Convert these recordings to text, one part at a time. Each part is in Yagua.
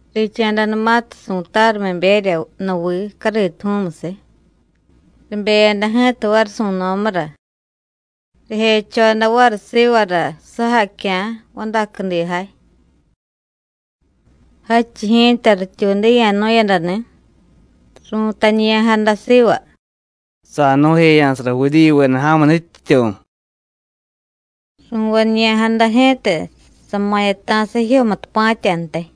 Richa̱danumatiy su̱tarumiberya nuvii cariituju̱u̱musiy, ribeyada ji̱ta variy su̱no̱mura, rijechoda variy sivara sujacya̱ vadacudijay, jadchiy ji̱ta rityuudiya̱nu̱yadani̱, ru̱tañiya̱jada siva: “¡Sa̱jnu̱jeya̱sara Judíyuveda ja̱mu nutyityu̱!” Ru̱vañiya̱jada ji̱ta sama̱yata̱sa jijyomutupa̱tyantiy.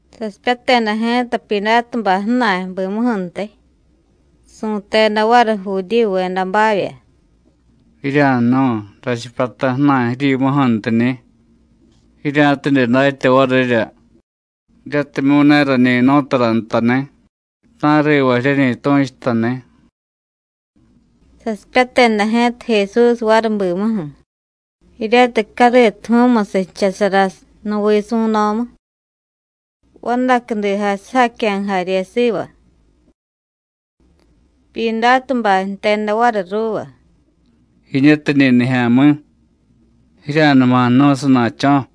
Sasipyateda ji̱ta Pyidátubay ju̱na̱y bimuju̱ntiy, su̱teda variy Judíyuvedabavya: “Jirya̱jnu̱y, rachipyata ju̱na̱y jiryimuju̱ntiñi̱, jirya̱tidye datya varirya jiryatimyu̱ ne rañi jnu̱y tara ntani̱, ta̱riva jiryeñi tu̱chutani̱.” Sasipyateda ji̱ta Jesús variy bimuju̱, jiryatiy cariituju̱u̱musiy jchasara nuvii su̱no̱mu, vadacudijay sujacya̱ jarye siva. Pyidátubay jteda variy ruuva: “¡Jiñutiñi̱ nijya̱mi̱! ¡Jirya̱numa jnu̱y sana̱cho̱!”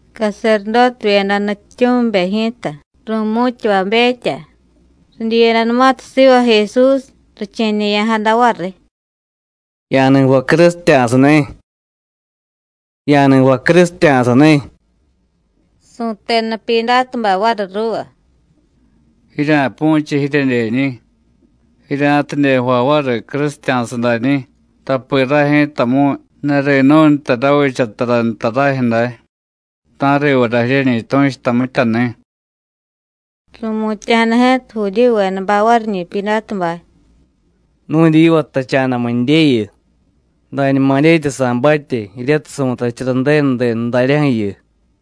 Caserdótevyeda nutyityu̱mibe ji̱ta, ru̱mu̱tyavabetya, ridyiyadanumatiy siva Jesús, riche̱ñe̱ya̱jada variy: “¡Ya̱ni jvay crusitya̱sani̱! ¡Ya̱ni jvay crusitya̱sani̱!” Su̱teda Pyidátubay variy ruuva: “Jirya̱pu̱chiy jiryedyeñi̱, jirya̱tidye jvay variy crusitya̱sa dañi̱, tapi ray ji̱tamu̱y ne ri̱nu̱y nta ravicha tara nta rajyu̱ day, ta̱rivara jiryeñi tu̱chuta mityani̱.” Ru̱mutya̱jada ji̱ta Judíyuvedabay variñi̱ Pyidátubay: “Nu̱dyiva jtacha̱damu̱ndyeyu, dañuma dyetya sa̱batye, jiryatiy su̱tachara Ju̱denu denu daryaju̱yu.”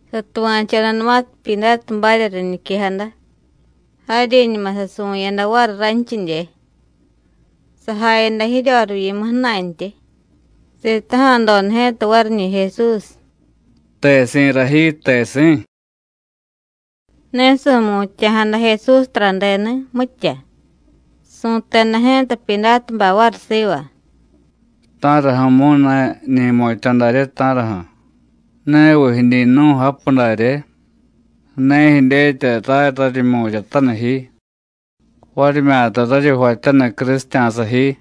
Satuva̱chodanumatiy Pyidátubarya riñiquejada, jaryiñuma sasuvu̱yada variy ranchidye. Sajayada jiryorivyimu ju̱na̱ntyi, sitaja̱doda ji̱ta variñi̱ Jesús: “¿Tesi̱ra ji, tesi̱?” Ne su̱mutya̱jada Jesús taradeni̱, mitya. Su̱teda ji̱ta Pyidátubay variy siva: “¿Ta̱raju̱mu̱y ne jiñi jmutya̱ darye, ta̱raju̱? ¿Neviy jiñi jnu̱y japu darye? ¿Ne jidyetya ray raryi jmu̱ryataniy ji, varimyata raryi jvatyaniy crusitya̱sa ji?”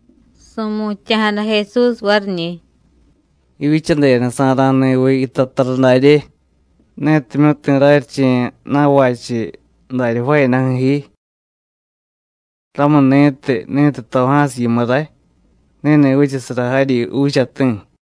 Su̱mutya̱jada Jesús variñi̱: “Jivyichadedasa̱ra̱ ni̱viy yitay tara darye, netimyu̱ ne ti̱ raryiche̱ na̱vachiy darya jvaayadaju̱ ji. Ramuni̱tiy, ni̱tiy toja̱siy yimu ray, ni̱ni̱ vichasara jaryi juuchati̱.”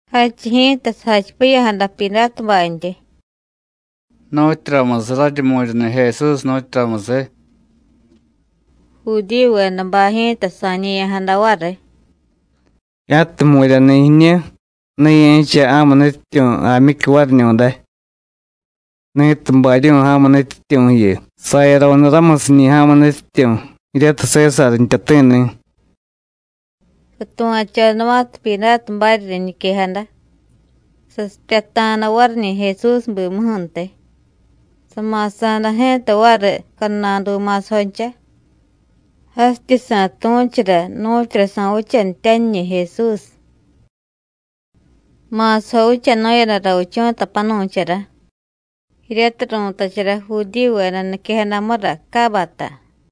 Jadchiy ji̱ta sajachipiya̱jada Pyidátubantyi: “¿Nu̱tyuramusiy raryi jmu̱ryani̱ Jesús, nu̱tyuramusiy?” Judíyuvedabay ji̱ta sa̱ñe̱ya̱jada variy: “¡Ya̱tiy jmu̱ryani̱ jiñu, ne ye̱cha ja̱mu nutyityu̱ jaamyicyu variñu̱day! ¡Ni̱tiy baryu̱y ja̱mu nutyityu̱ju̱yu, sayaro̱nu ramusiñi̱ ja̱mu nutyityu̱ jiryatiy Sésar jtyati̱ni̱!” Satuva̱chodanumatiy Pyidátubarya riñiquejada, sasipyata̱da variñi̱ Jesús bimuju̱ntiy, sama̱sa̱da ji̱ta variy cadnadu ma̱sajoncha, jasityi sa̱tu̱chura nu̱tyura sa̱vichanityaniñi̱ Jesús. Ma̱sajo vichanu̱yada ravichu̱ta panu̱chara, jiryatiy ru̱tachara Judíyuveda niquejadamura Cábata.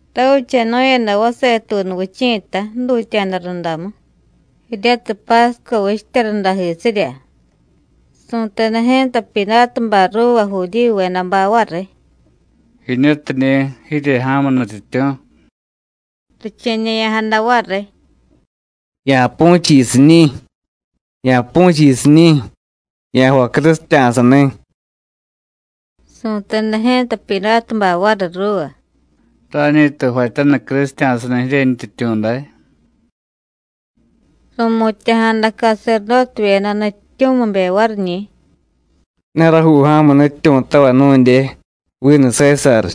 Ravichanu̱yada vasetuunu vichi̱ta jdutya̱da rundamu, jiryatiy pásco vichtya rundajisirya. Su̱teda ji̱ta Pyidátubay ruuva Judíyuvedabay variy: “Jiñutiñi̱ jirye ja̱mu nutyityu̱.” Riche̱ñe̱ya̱jada variy: “¡Ya̱pu̱chiy jiyusiñi̱! ¡Ya̱pu̱chiy jiyusiñi̱! ¡Ya̱jvay crusitya̱sani̱!” Su̱teda ji̱ta Pyidátubay variy ruuva: “¿Ra̱ñi̱tiy jvatyaniy crusitya̱sani̱ jiryentyityu̱ day?” Ru̱mutya̱jada caserdótevyeda nutyityu̱mibe variñi̱: “Ne rajuu ja̱mu nutyityu̱tavay nu̱ndye, vinu Sésar.”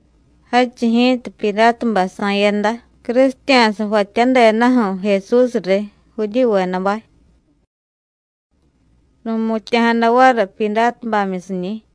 Jadchiy ji̱ta Pyidátubay sa̱yada crusitya̱sa jvatyadedaju̱ Jesús riy Judíyuvedabay. Ru̱mutya̱jada variy Pyidátubamyusiñi̱.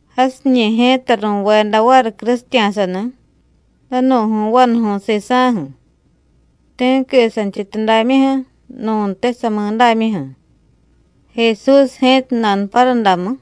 Jasiñi̱ ji̱ta ru̱veda variy crusitya̱sani̱, danu̱ju̱y vanuju̱y sisa̱ju̱, ti̱qui santyityudamyuju̱, nu̱ntiy samidámyuju̱, Jesús ji̱ta nanuparudamu.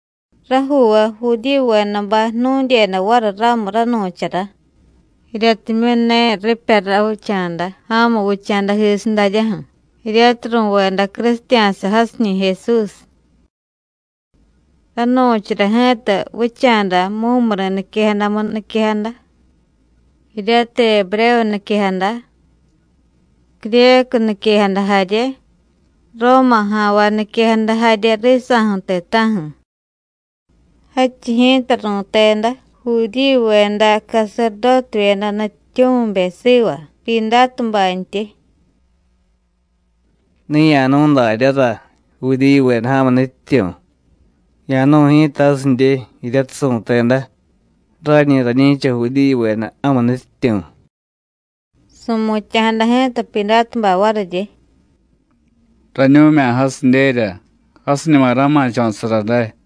Rajuuvay Judíyuvedabay jnu̱dyeda variy ramu ranu̱chara, jiryatimyu̱ ne ripya ravicha̱da ja̱mu vicha̱dajisiy daryaju̱, jiryatiy ru̱veda crusitya̱sa jasiñi̱ Jesús. Ranu̱chara ji̱ta vicha̱da mumuri̱ niquejadamu niquejada, jiryatiy Ebrévu niquejada, Cryécu niquejada jarye, Róma ja̱nvay niquejada jarye risa̱ju̱ ti̱ta̱ju̱. Jadchiy ji̱ta ru̱teda Judíyuveda caserdótevyeda nutyityu̱mibe siva Pyidátubantyi: “Ne ya̱nu̱y daryára: Judíyuveda ja̱mu nutyityu̱. Ya̱nu̱y ji̱ta jasidye, jiryatiy su̱teda: Rañi rañi̱cha Judíyuveda ja̱mu nutyityu̱.” Su̱mutya̱jada ji̱ta Pyidátubay variryi: “Rañu̱mya̱ jasidyerya. Jasiñuma ra̱ma̱cho̱sara day.”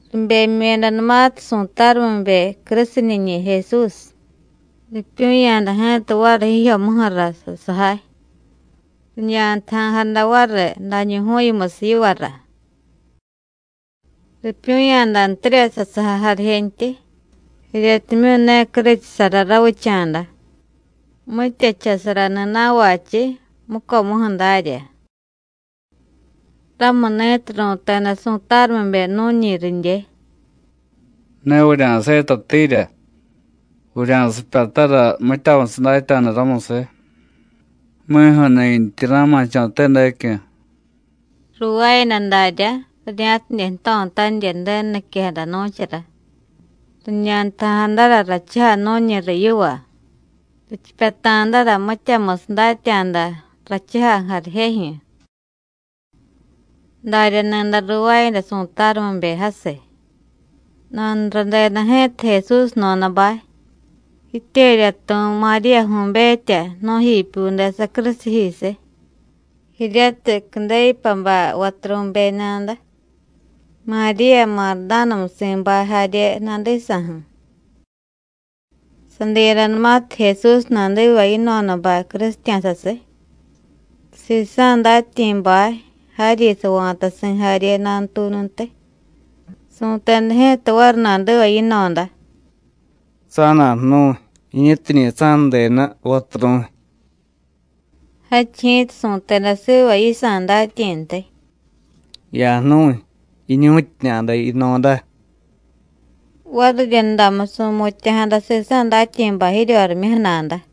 Ribemyu̱yadanumatiy su̱tarumibe crusiniñi̱ Jesús, ripyu̱ya̱da ji̱ta variy jijyomuju̱ra sasujay, riñantaja̱jada variy dañuju̱yumusiy yivara. Ripyu̱ya̱dantirya sasujay jarijentyi, jiryatimyu̱ ne curuchusara ravicha̱da, mitya jchasarani̱ na̱vachiy, mucomuju̱ darya. Ramuni̱tiy ru̱teda su̱tarumibe nu̱ñi ridye: “Ne vurya̱setatiirya, vurya̱sipyatara mityamusiy datya̱da ramusiy, mi̱ju̱nintyi ra̱ma̱cho̱te dacyu̱.” Ruuvaayada daryá, rirya̱tidye jto̱tanirya Ju̱denu niquejada nu̱chara: “Riñantaja̱jadara rachujay nu̱ñi riy yiva, richipyata̱dara mityamusiy datya̱da rachujay jarijejyu̱.” Darya ni̱day ruuvaayada su̱tarumibe jasiy. Nanuradeda ji̱ta Jesús jno̱dabay, jityeryatu̱y Maríyaju̱betya nu̱jipyude sacrusiyjisiy, jiryatiy Cudéyupabay vaturu̱beñada, Maríya Mardánamusi̱bay jarye nadisa̱ju̱. Sadiyadanumatiy Jesús nadiva yino̱dabay crusitya̱sasiy, sisa̱ datyi̱bay jaryi sava̱tasi̱ jarye nanutuununtiy, su̱teda ji̱ta variy nadiva yino̱da: “Sa̱na̱jnu̱y, jiñutiñi̱ sa̱nudenu, vaturu̱y.” Jadchiy ji̱ta su̱teda siva yisa̱ datyi̱ntiy: “Ya̱jnu̱y, jiñu̱tyiñada yino̱da.” Variryundamu, su̱mutya̱jada sisa̱ datyi̱bay jiryorimyuju̱ nada.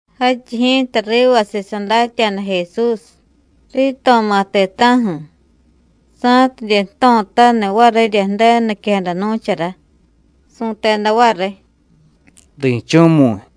Jadchiy ji̱ta rivasiy sadatya̱da Jesús: Rito̱ma̱ ti̱ta̱ju̱. Sa̱tidye jto̱taniy varirya Ju̱denu niquejada nu̱chara, su̱teda variy: “¡Ri̱chu̱mu̱y!”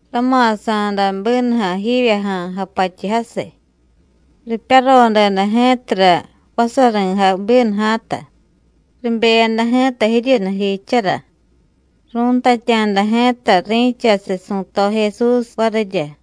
Rama̱sa̱da bínuja̱ jivyaja̱a̱ japatyu jasiy. Ripyarodeda ji̱tara vasari̱jay bínuja̱ta. Ribeyada ji̱ta jiryunujiijchara, ru̱ntatya̱da ji̱ta ri̱chasiy su̱to Jesús varirya.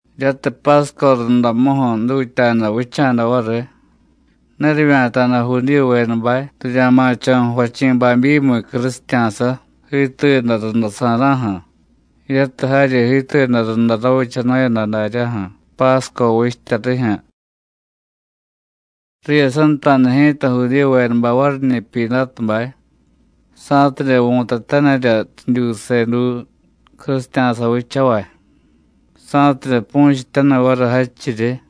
Jiryatiy Pásco rundamuju̱ jdutya̱da vicha̱da variy, ne rivya̱ta̱da Judíyuvedabay rirya̱ma̱cho̱ jvachi̱ babyimiy crusitya̱sa, jiituyada rundasa̱ra̱ju̱, jiryatiy jaryi jiituyada runda ravichanu̱yada daryaju̱ Pásco vichtya rijyu̱. Riyasanta̱da ji̱ta Judíyuvedabay variñi̱ Pyidátubay, sa̱tidye vu̱tatanirya ridyuuseduu crusitya̱sa vichavay, sa̱tidye pu̱chityaniy variy jadchiryi.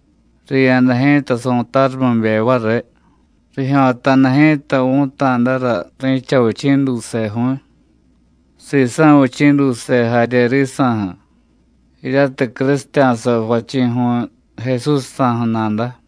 Riya̱da ji̱ta su̱tarumibe variy, rijyo̱ta̱da ji̱ta vu̱ta̱dara ri̱cha vichi̱ duuseju̱y, sisa̱ vichi̱ duuse jarye risa̱ju̱, jiryatiy crusitya̱sa jvachi̱ju̱y, Jesúsjsa̱ju̱ nada.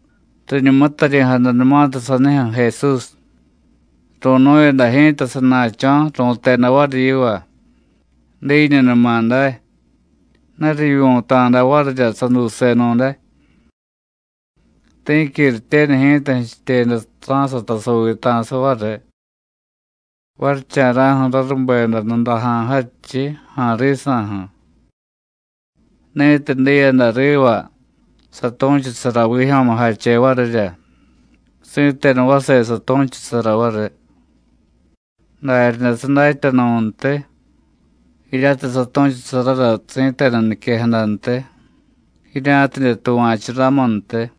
Riñumutaryi̱jadanumatiy sanijyu̱ Jesús, ru̱nu̱yada ji̱ta sana̱cho̱, ru̱teda variy yiva: “Diiñunuma day,” ne rivyu̱ta̱da varirya saduusenu̱day. Ti̱qui rityenu ji̱ta jchityeda ra̱sata saviita̱sa variy. Varicha̱ra̱ju̱ rarubeda nudaja̱ jadchiy, ja̱a̱ risa̱ju̱. Ni̱tiy diyada riva, satu̱chusara vijyo̱mujache varirya, si̱tenu vase satu̱chusara variy. Daryaday sadatya nu̱ntiy, jiryatiy satu̱chusarara si̱tenu niquejadantiy, jirya̱tidye tuva̱chu ramuntiy.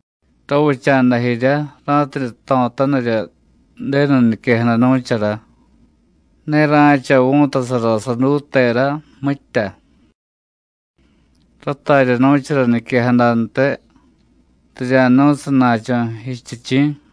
Ravicha̱da jiryá, ra̱tidye jto̱tanirya Ju̱denu niquejada nu̱chara: “Ne ra̱cha vu̱tasara saduutera, mitya.” Ratarya nu̱chara niquejadantiy: “Rirya̱jnu̱y sana̱cho̱ jichityichi̱.”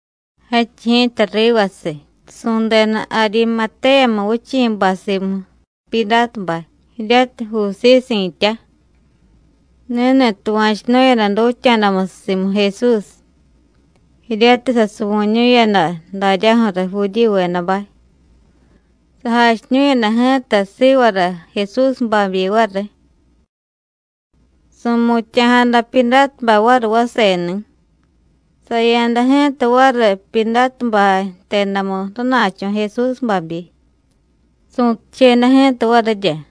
Jadchiy ji̱ta rivasiy, su̱deda Arimatéyamu vichi̱bay simu Pyidátubay, jiryatiy Jusíy si̱tya. Ni̱ni̱ tuva̱chunu̱yada dutya̱damusiy simu Jesús, jiryatiy sasuvu̱ñu̱yada daryaju̱riy Judíyuvedabay. Sajachiñu̱yada ji̱ta sivara Jesús babyi variy. Su̱mutya̱jada Pyidátubay variy vaseni̱. Saya̱da ji̱ta variy Pyidátubay jtedamu rana̱cho̱ Jesús babyi, su̱tucheda ji̱ta varirya.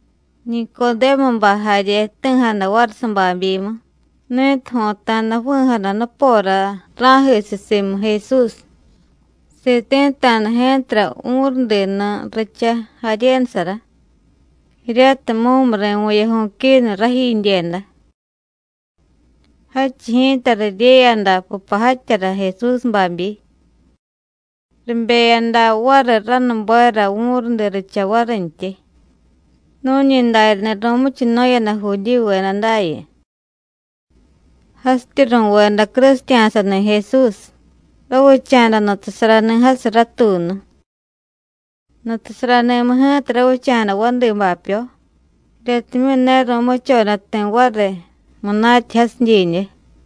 Nicodémubay jarye jti̱jada variy sababyimu, ni̱tiy jo̱ta̱da ju̱vi̱jada nupora ra̱jisiy simu Jesús. Siti̱ta̱da ji̱tara vu̱rudinu richa jaryenusara, jiryatiy mumuri̱ vu̱yaju̱y quinu rajidyeda. Jadchiy ji̱ta riryeyada pupajatyara Jesús babyi, ribeyada variy ranubera vu̱rudi richa varintyi, nu̱ñi daryani̱ ru̱muchunu̱yada Judíyuveda dayu. Jasityi ru̱veda crusitya̱sani̱ Jesús, ravicha̱da nutasarani̱ jasiy ratuunu. Nutasarani̱mu ji̱ta ravicha̱da vadi bapyo, jiryatimyu̱ ne ru̱muchoda ti̱ variy munatya jasiy didye.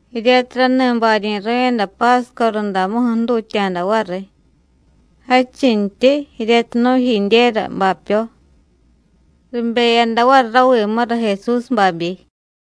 Jiryatiy rani baryi̱ru̱yada Pásco rundamuju̱ jdutya̱da variy, jadchintyi, jiryatiy nu̱jidyera bapyo, ribeyada variy ravimura Jesús babyi.